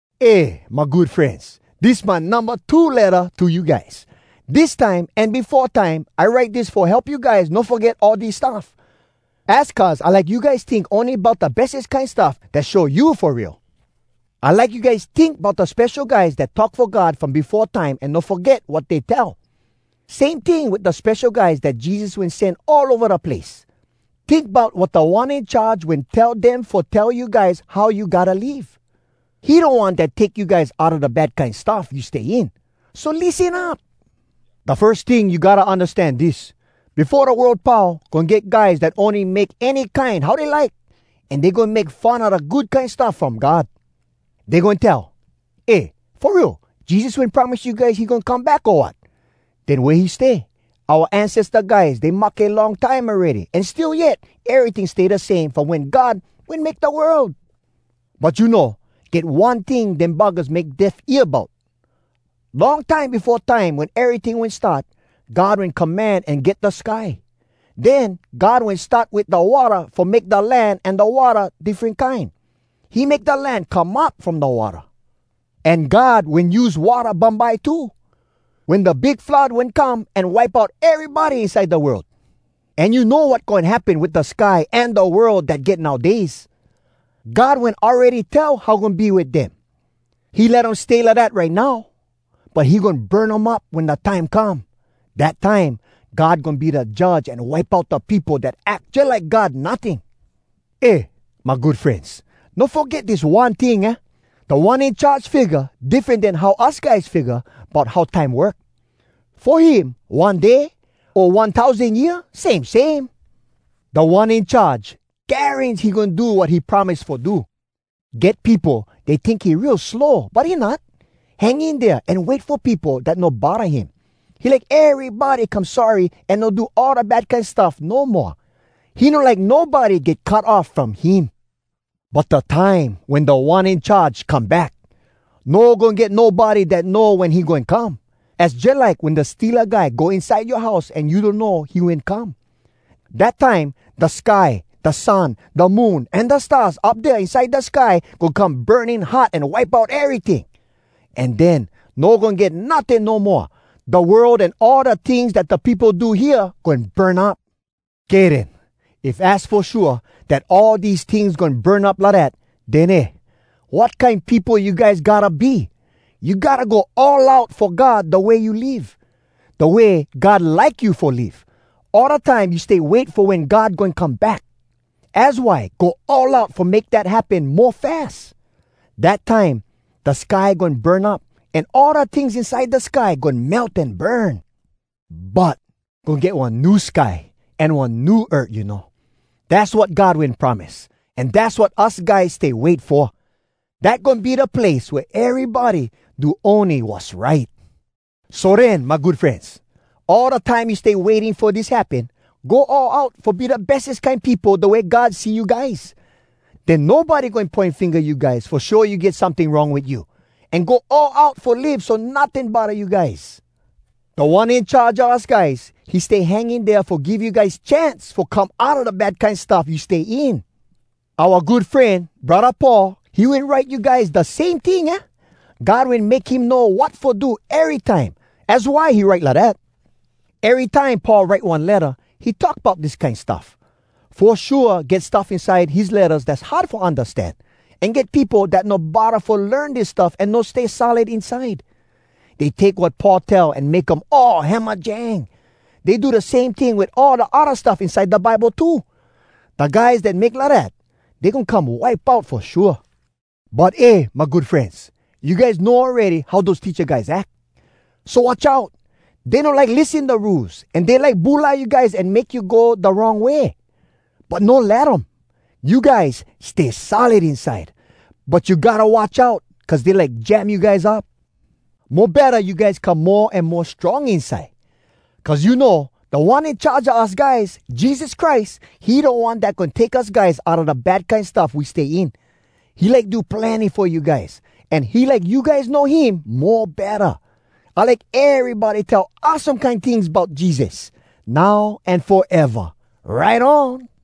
Eh, my good frenz, dis my numba two letta to you guys. Dis time an befo time, I write dis fo help you guys no foget all dis stuff. Az cuz I like you guys tink ony bout da bestes kine stuff dat show you fo real. I like you guys tink bout da spesho guys dat talk fo God from befo time an no foget wat dey tell. Same ting wit da spesho guys dat Jesus wen sen all ova da place. Tink bout wat Da One In Charge wen tell dem fo tell you guys how you gotta live. He da One dat take you guys outa da bad kine stuff you stay in. So lissen up! Da firs ting, you gotta undastan dis: befo da world pau, goin get guys dat ony goin make any kine how dey like. An dey goin make fun a da Good Kine Stuff from God. Dey goin tell, “Eh! Fo real, Jesus wen promise you guys he goin come back, o wat? Den wea he stay? Oua ancesta guys, dey mahke long time awready, an still yet, eryting stay da same from wen God wen make da world!” But you know, get one ting dem buggahs make deaf ear bout: Long time befo time, wen eryting wen start, God wen command an get da sky. Den God wen start wit da watta fo make da land an da watta diffren kine. He make da land come up from da watta. An God wen use watta bumbye too, wen da big flood wen come an wipe out erybody inside da world. An you know wat goin happen wit da sky an da world dat get nowdays? God wen awready tell how goin be wit dem. He let um stay lidat right now, but he goin burn um up wen da time come. Dat time, God goin be da Judge an wipe out da peopo dat ack jalike God notting. Eh, my good frenz! No foget dis one ting, aah? Da One In Charge figga diffren den how us guys figga bout how time work. Fo him, one day, o one tousan year, same same. Da One In Charge, garans he goin do wat he wen promise fo do. Get peopo, dey tink he real slow, but he not! Hang in dea an wait fo peopo, dat no bodda him. He like erybody fo come sorry an no do all da bad kine stuff no moa. He no like nobody get cut off from him! But da time wen Da One In Charge come back, no goin get nobody dat know wen he goin come. Az jalike wen da steala guy go inside yoa house an you donno he wen come. Dat time, da sky, da sun, da moon, an da stars up dea inside da sky goin come burning hot an wipe out eryting! An den, no goin get notting no moa. Da world an all da tings dat peopo do hea goin burn up. Kay den. If az fo shua, dat all dese tings goin burn up lidat, den eh! wat kine peopo you guys gotta be? You gotta go all out fo God da way you live, da way God like you fo live, all da time you stay wait fo wen God goin come back. Az why go all out fo make dat happen mo fas. Dat time, da sky goin burn up, an all da tings inside da sky goin melt an burn. But goin get one new sky an one new earth, you know. Dass wat God wen promise, an dass wat us guys stay wait fo. Dat goin be da place wea erybody do ony wass right. So den, my good frenz, all da time you stay waiting fo dis happen, go all out fo be da bestes kine peopo da way God see you guys. Den nobody goin poin finga you guys fo show you get someting wrong wit you. An go all out fo live so notting bodda you guys. Da One In Charge a us guys, he stay hang in dea fo give you guys chance fo come outa da bad kine stuff you stay in. Oua good fren, braddah Paul, he wen write you guys da same ting, aah? God wen make him know wat fo do erytime. Az why he write lidat. Erytime Paul write one letta, he talk bout dis kine stuff. Fo shua, get stuff inside his lettas dass hard fo undastan. An get peopo dat no bodda fo learn dis stuff an no stay solid inside. Dey take wat Paul tell an make um all hamajang. Dey do da same ting wit all da odda stuff inside da Bible too. Da guys dat make lidat, dey goin come wipe out fo shua. But eh! my good frenz. You guys know awready how dose teacha guys ack. So watch out! Dey no like lissen da rules, an dey like bulai you guys an make you go da wrong way, but no let um. You guys stay solid inside, but you gotta watch out cuz dey like jam you guys up. Mo betta you guys come mo an mo strong inside. Cuz you know, Da One In Charge a us guys, Jesus Christ, he da One dat goin take us guys outa da bad kine stuff we stay in. He like do plenny fo you guys, an he like you guys know him mo betta. I like erybody tell awesome kine tings bout Jesus, now an foeva! Right on!